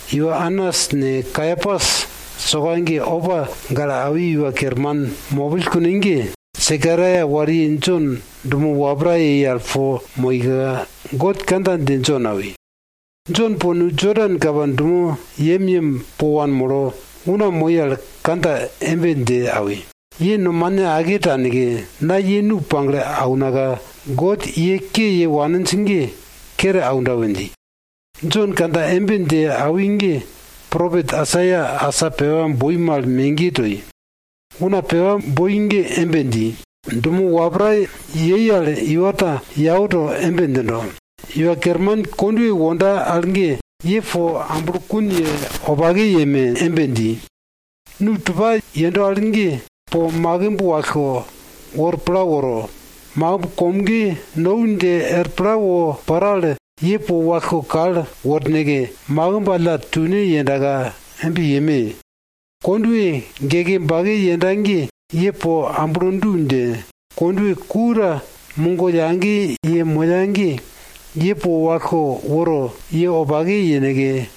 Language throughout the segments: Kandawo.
Iwa Anas ne, Kaiapas soka ge opa gale awi iwa kerman mopill kune ge, Sekaraia wariye Jon dumo wapra yei al po moika, God kandja dje Jon awi. Jon po nu Jodan kapa dumo yemyem po wanmolo, una moi al kandja embe dje awi, ye nomane ake taneke, na ye nu pagle aunaka, God ye ke ye waninj ge kere aunda we dji. Jon kandja embe dje awi ge, propet Aisaia asa pepa boi mal megiye toi. Une pepa boi ge embe dji, Dumo wapra yei al iwa ta yau to embe djindo, Iwa Kerman kondwe wonda al ge, ye po amblokun ye wopake yeme! dji. Nu tupa yendo al ye po makimb wallko wor pla woro, makimb komge nou dje er pla wo paro al, ye po wallko kal worneke, makimb alla tune yendaka embe yeme! Kondwe geke bake yenda ge, ye po amblo du dje, kondwe ku ta mugo yage ye moya ge, ye po wallko woro ye wopake yeneke,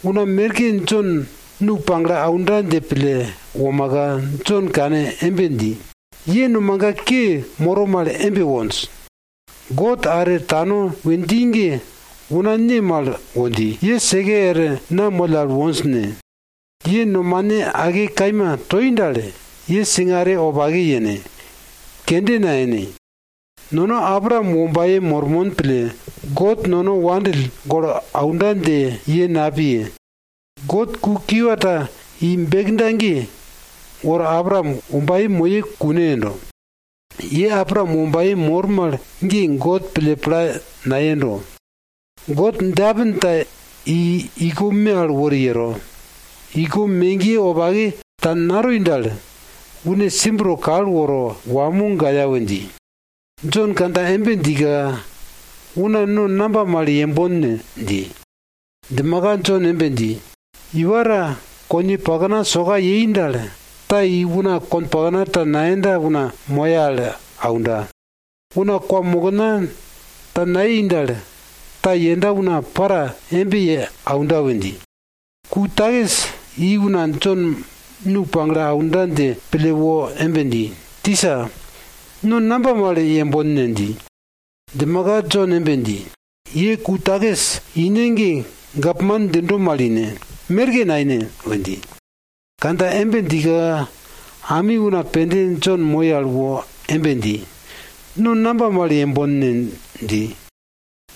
Una merke Jon nu pagle aunda dje pille womaka, Jon kane embe dji, ye nomaga ke moro mal embe wonj. God are tano we dji ge una ne mal wo dji, ye seke er na moll al wonj ne? Ye nomane ake kaima toi dal, ye singare wopake yene, kende nayene. Nono Abraam wombaye mormon pille God nono wandill golo aunda dje ye napiye! God ku kiwa ta i bekda ge, wor Abraam wombaye moye, kune yendo. Ye Abraam wombaye mor mal ge God pille pla nayendo. God djeapin ta i iko me al wori yero. Iko megiye wopake ta natoi dal, une simb to kal woro wamo gaya we dji. Jon kandja embe djika, una no namba mal yembon ne? dji. Djimaka, Jon embe dji, iwa ta koniye pakna soka yei dal, ta i una konpakna ta nayenda una moya al aunda. Una kwamokna ta nayei dal, ta yenda una para embe ye aunda we dji. Ku takis i una Jon nu pagle aunda dje pille wo embe dji, tisa, no namba mal yembon ne? dji. Djimaka Jon embe dji, ye ku takis ine ge gapman djindo mal ine, merke naine! we dji. Kandja embe djika, ami una pende Jon moi al wo embe dji, no namba mal yembon ne? dji.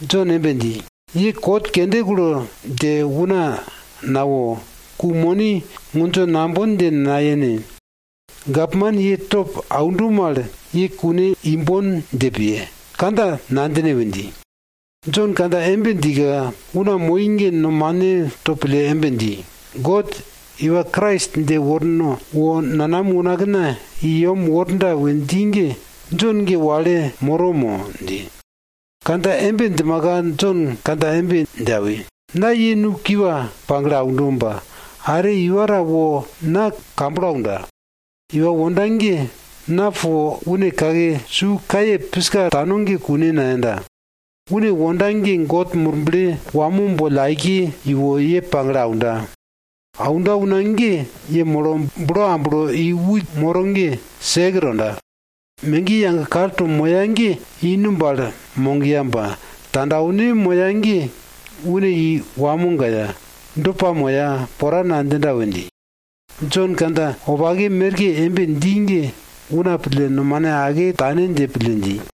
Jon embe dji, ye kot kende kulo dje una nawo, ku moni ngundjo nambon dje nayene. Gapman ye top aundo mal, ye kune imbon dje piye, kandja nadjine we dji. Jon kandja embe djika, una moi ge nomane to pille embe dji, God Iwa Krais dje worno wo nanam unakna i yem worda we dji ge, Jon ge wale moro mo? dji. Kandja embe djimaka Jon kandja embe dje awi, na ye nu kiwa pagle aundo ba, are iwa ta wo na kamblo aunda. Iwa wonda ge na po une kake su kaye piska tano ge kune nayenda. Une wonda ge God Murble wamo boll aike iwo ye pagle aunda. Aunda una ge yemolo bulo amblo i wit moro ge sek tonda. Megiye yage kalto moya ge i numb al mogiya ba, tandwane moya ge une i wamo gaya, do pamoya, pora nadjinda we dji. Jon kandja wopake merke embe dji ge una pille nomane ake tane dje pille dji.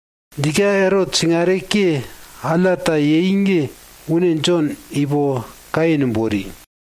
Djika Erot singare ke alla ta yei ge une Jon ipo kaye numb wori.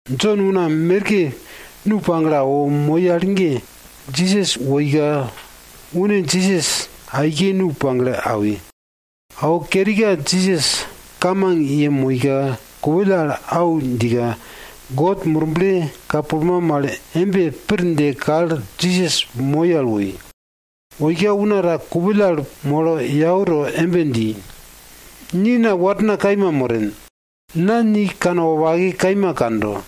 Jon una merke nu pagle awo moi al ge, Jisas woika une Jisas aike nu pagle awi. Awo kerika Jisas kamang yemoika, kupill al au djika, God Murble ka pulma mal embe pir dje kal Jisas moi al woi. Woika una ta kupill al molo yau to embe dji, ni na warna kaima moren. Na ni kanwopake kaima kando,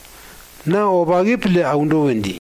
na wopake pille aundo we dji.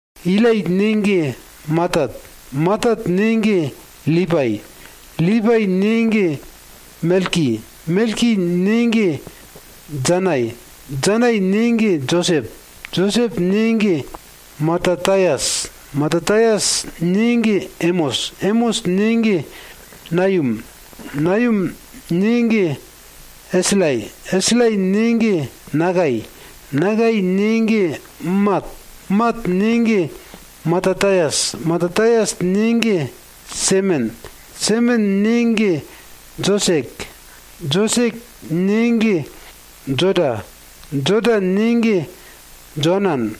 Ilai ne ge Matat. Matat ne ge Lipai. Lipai ne ge Melki. Melki ne ge Janai. Janai ne ge Josep. Josep ne ge Matatayas. Matatayas ne ge Emos. Emos ne ge Nayum. Nayum ne ge Eslai. Eslai ne ge Nakai. Nakai ne ge Mat. Mat ne ge Matatayas. Matatayas ne ge Semen. Semen ne ge Josek. Josek ne ge Joda. Joda ne ge Joanan.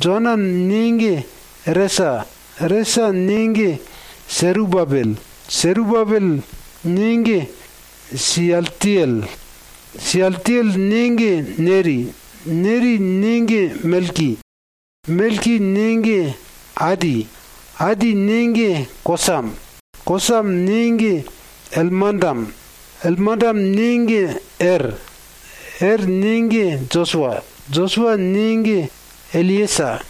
Joanan ne ge Resa. Resa ne ge Serubabel. Serubabel ne ge Siyaltiyel. Siyaltiyel ne ge Neri. Neri ne ge Melki. Melki ne ge Adi. Adi ne ge Kosam. Kosam ne ge Elmandam. Elmandam ne ge Er. Er ne ge Josua. Josua ne ge Eliyesa.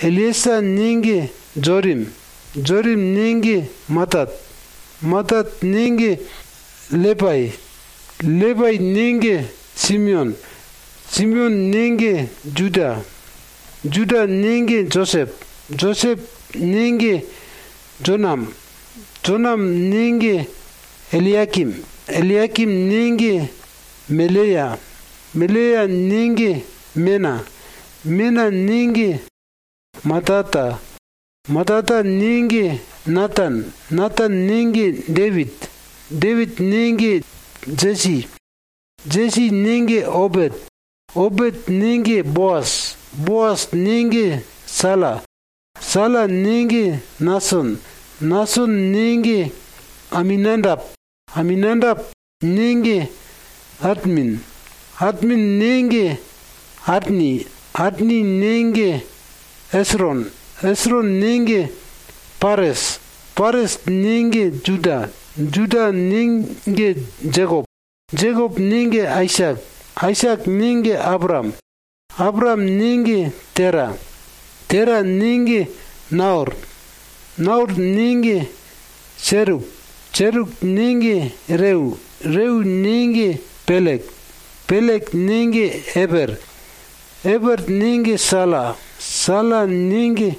Eliyesa ne ge Jorim. Jorim ne ge Matat. Matat ne ge Lepai. Lepai ne ge Simeon. Simeon ne ge Juda. Juda ne ge Josep. Josep ne ge Jonam. Jonam ne ge Eliyakim. Eliyakim ne ge Meleya. Meleya ne ge Mena. Mena ne ge Matata. Matata ne ge Natan. Natan ne ge Depit. Depit ne ge Jesi. Jesi ne ge Obet. Obet ne ge Boas. Boas ne ge Sala. Sala ne ge Nason. Nason ne ge Aminadap. Aminadap ne ge Admin. Admin ne ge Arni. Arni ne ge Esron. Esron ne ge Pares. Pares ne ge Juda. Juda ne ge Jekop. Jekop ne ge Aisak. Aisak ne ge Abraam. Abraam ne ge Tera. Tera ne ge Naor. Naor ne ge Seruk. Seruk ne ge Reu. Reu ne ge Pelek. Pelek ne ge Eper. Eper ne ge Sala. Sala ne ge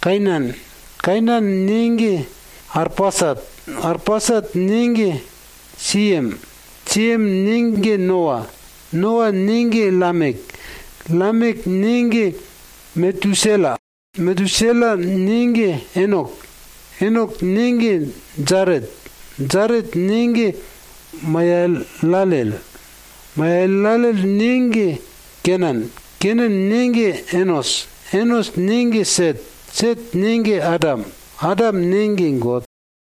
Kainan. Kainan ne ge Arpasat. Arpasat ne ge Siyem. Siyem ne ge Noa. Noa ne ge Lamek. Lamek ne ge Metusela. Metusela ne ge Enok. Enok ne ge Jaret. Jaret ne ge Mayalalel. Mayalalel ne ge Kenan. Kenan ne ge Enos. Enos ne ge Set. Set ne ge Adam. Adam ne ge God.